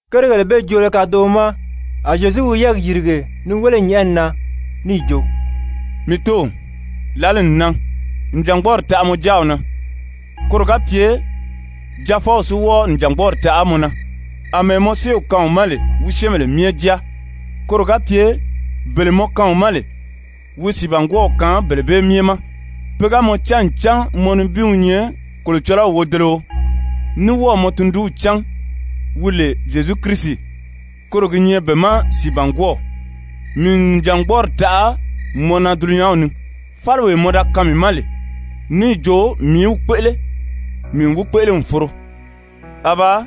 Kérigèle bee joolo kadoʔo ma, a Zyezu wi yɛ́ɛgi yìrige ni wéle nyɛ̀ʔɛni na níì jo: «Mii Tóow, lǎli n nan, nìjangbɔɔri taʔa mɔ Jáaw na, koro ga pye Jaafɔw si wɔ́ɔ nìjangbɔɔri taʔa mɔ na, àmɛɛ mɔ séew kaan wi ma lè wi syɛ́ɛnbèle myɛ jáa, koro ga pye bele mɔ kaan wi ma lè, wi sìibangwɔɔw kaan bele bee myɛ ma. Pe ga mɔ cán ncan mɔ nibin wi nyɛ Kolocɔlɔw wodeleo, ní wɔ́ɔ̀ mɔ Tundunw cán wi lè Zyezu Kirisi, koro gi nyɛ be ma sìibangwɔɔw. Mii n nìjangbɔɔri taʔa mɔ na dulunyanw ni. Fáliwee mɔ da kaan mii ma lè, níì jo mii í wi kpéʔele, mii n wi kpéʔele n foro. Abaa,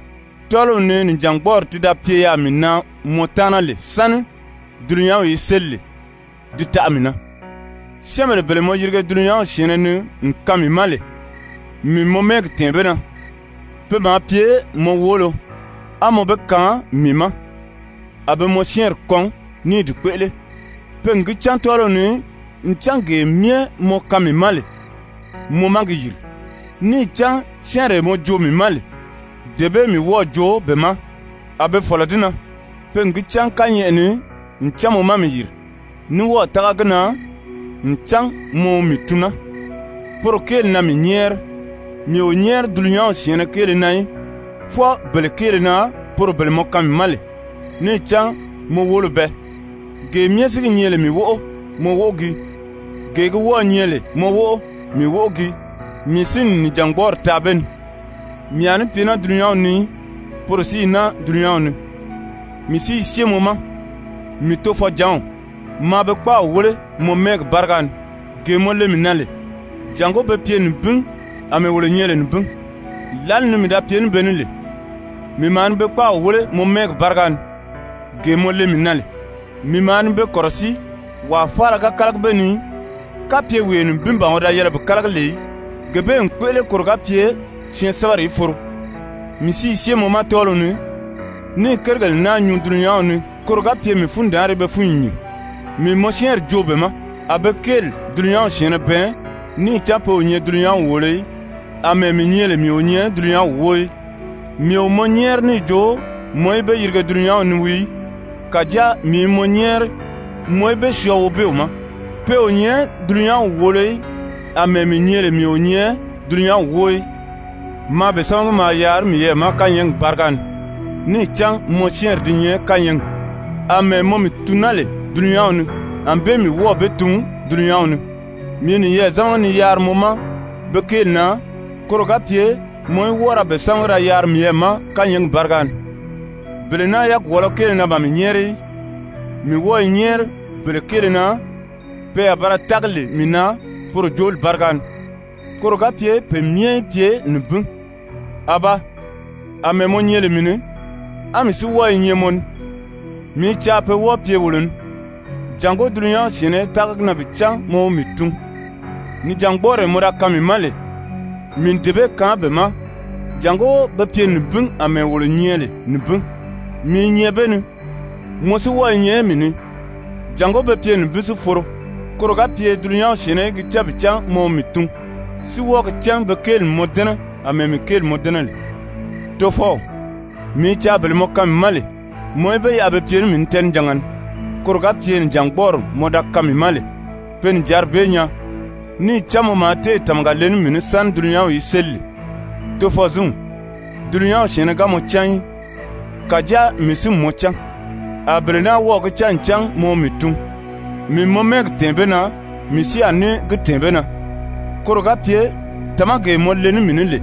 tɔ́ɔliw ni nìjangbɔɔri ti da pye yaà mii na mɔ taana lè sáni dulunyanw í séli lè, di taʔa mii na. Syɛ́ɛnbèle bele mɔ yirige dulunyanw syɛ̀ɛnnɛ ni n kaan mii ma lè, mii n mɔ mɛ́ɛgi tɛ̀ɛn be na. Pe maa pye mɔ woolo, á mɔ be kaan mii ma, a be mɔ syɛ́ɛnri kɔn ní i di kpéʔele. Pe n gi cán tɔ́ɔliw ni ncan gee myɛ mɔ kaan mii ma lè, mɔ má gi yìri. Níì cán syɛ́ɛnree mɔ joo mii ma lè, dee bee mii wɔ́ɔ̀ joo be ma, a be fɔ̀lɔ di na. Pe n gi cán kányɛʔɛ ni ncan mɔ má mii yìri, ní wɔ́ɔ̀ tága gi na ncan mɔ wi mii tun naa. Poro kéeli na mii nyɛ́ɛri. Mii o nyɛ́ɛri dulunyanw syɛ̀ɛnnɛ kéele na í, fwɔɔ bele kéele na poro bele mɔ kaan mii ma lè, níì cán mɔ woolo bɛɛ, gee myɛ si gi nyɛ lè mii wóʔo, mɔ wóʔo gii, gee gi wɔ́ɔ̄ nyɛ lè mɔ wóʔo, mii wóʔo gii, mii si n nìjangbɔɔri taa be ni. Mii a ní pye naa dulunyanw ni í, poro si i naa dulunyanw ni, mii si i syée mɔ ma. Mii Tofɔjǎnw, maa be kpáaw wéle mɔ mɛ́ɛgi báriga ni, gee mɔ le mii na lè, jàngó be pye nibin àmɛɛ wolo nyɛ lè nibin. Lǎli ni mii da pye ní be ní lè, mii maa ni be kpáaw wéle mɔ mɛ́ɛgi báriga ni, gee mɔ le mii na lè. Mii maa ni be kɔ̀rɔsíi, wàa faala ga kálagi be ni í, kapye wee nibin ban wi da yɛlɛ bi kálagi lè í, gee bee n kpéʔele koro ga pye syɛɛnsɛbɛri í foro. Mii si i syée mɔ ma tɔ́ɔliw ni, ní i kérigèle naa nyuu dulunyanw ni koro ga pye mii fundaanri í be fúnyi nyìn. Mii n mɔ syɛ́ɛnri joo be ma, a be kéeli dulunyanw syɛ̀ɛnnɛ bɛɛn níì cán pe o nyɛ dulunyanw wòolo í, àmɛɛ mii nyɛ lè mii o nyɛ dulunyanw wóo í. Mii o mɔ nyɛ́ɛri níì jo mɔ í be yirige dulunyanw ni wii í, kàjáa mii i mɔ nyɛ́ɛri mɔ í be syɔɔ Wobeew ma. Pe o nyɛ dulunyanw wòolo í, àmɛɛ mii nyɛ lè mii o nyɛ dulunyanw wóo í. Maa be sámagi maa yaari miyɛɛ ma kányɛɛgi báriga ni, níì cán mɔ syɛ́ɛnri di nyɛ kányɛɛgi. Amɛɛ mɔ mii tun naa lè dulunyanw ni, ànbée mii wɔ́ɔ̀ be tun dulunyanw ni. Mii i niyɛɛ zámagi ni yaari mɔ ma be kéeli na koro ga pye mɔ í wɔ́ɔ ra be sámagi da yaari miyɛɛ ma kányɛɛgi báriga ni. Bele naa yagwɔɔlɔ kéele na ban mii nyɛ́ɛri í, mii wɔ́ɔ i nyɛ́ɛri bele kéele na pe a ba ra tági lè mii na poro jooli báriga ni, koro ga pye pe myɛ í pye nibin. Abaa, àmɛɛ mɔ nyɛ lè mii ni, á mii si wɔ́ɔ i nyɛ mɔ ni, mii i caa pe wɔ́ɔ pye wolo ni, jàngó dulunyanw syɛ̀ɛnnɛ í tága gi na bi cán mɔ wi mii tun. Nìjangbɔɔree mɔ da kaan mii ma lè, mii n dee bee kaan be ma, jàngó be pye nibin àmɛɛ wolo nyɛ lè nibin. Mii i nyɛ be ni, mɔ si wɔ́ɔ i nyɛ mii ni, jàngó be pye nibin si foro, koro ga pye dulunyanw syɛ̀ɛnnɛ í gi cán bi cán mɔ wi mii tun, si wɔ́ɔ gi cán be kéeli n mɔ dɛ́nɛ àmɛɛ mii kéeli mɔ dɛ́nɛ lè. Tofɔw, mii i caa bele mɔ kaan mii ma lè, mɔ í be yaʔa be pye ní mii ní tɛɛnijanga ni, koro ga pye nìjangbɔɔri mɔ da kaan mii ma lè, pe nìjanri bee nyaa, níì cán mɔ maa téè tàmaga le ní mii ní sáni dulunyanw í séli lè. Tofɔzinw, dulunyanw syɛ̀ɛnnɛ ga mɔ cán í, kàjáa mii si n mɔ cán, a bele naa wɔ́ɔ̀ gi cán ncan mɔ wi mii tun. Mii n mɔ mɛ́ɛgi tɛ̀ɛn be na, mii si a ní gi tɛ̀ɛn be na, koro ga pye tàmagee mɔ le ní mii ní lè,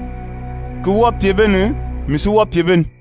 ki wɔ́ɔ pye be ni, mii si wɔ́ɔ pye be ni.»